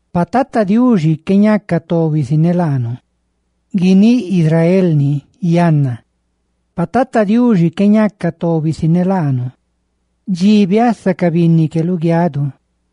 Pa Tata Diuxi qué ñaca tobi si ne laanu—guiníꞌ Israel ni yanna—, pa Tata Diuxi qué ñaca tobi si ne laanu, dxi biasa ca binni que luguianu,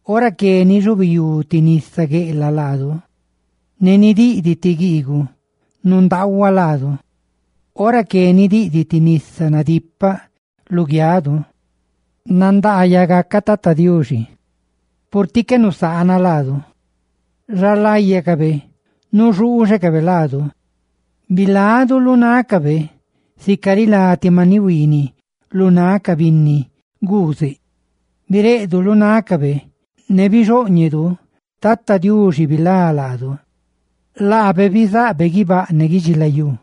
Ora que nixubiyú ti nisa gueꞌlaꞌ laanu; ¡ne nidiꞌdiꞌ ti guiiguꞌ nundaahuaꞌ laanu! ¡Ora que nidiꞌdiꞌ ti nisa cuxooñeꞌ nadipaꞌ luguianu! ¡Nandaayaꞌ gaca Tata Diuxi, purtiꞌ qué nusaana laanu xa láyacabe nuxuuxecabe laanu! Bilanu lu xaléꞌ xtícabe sica rilá ti maniꞌ huiiniꞌ lu náꞌ ca binni guuzeꞌ; bixá xaléꞌ xtícabe, ne gunda bixóꞌñenu. Tata Diuxi nga bilá laanu, laabe bizaꞌbe guibáꞌ ne guidxilayú.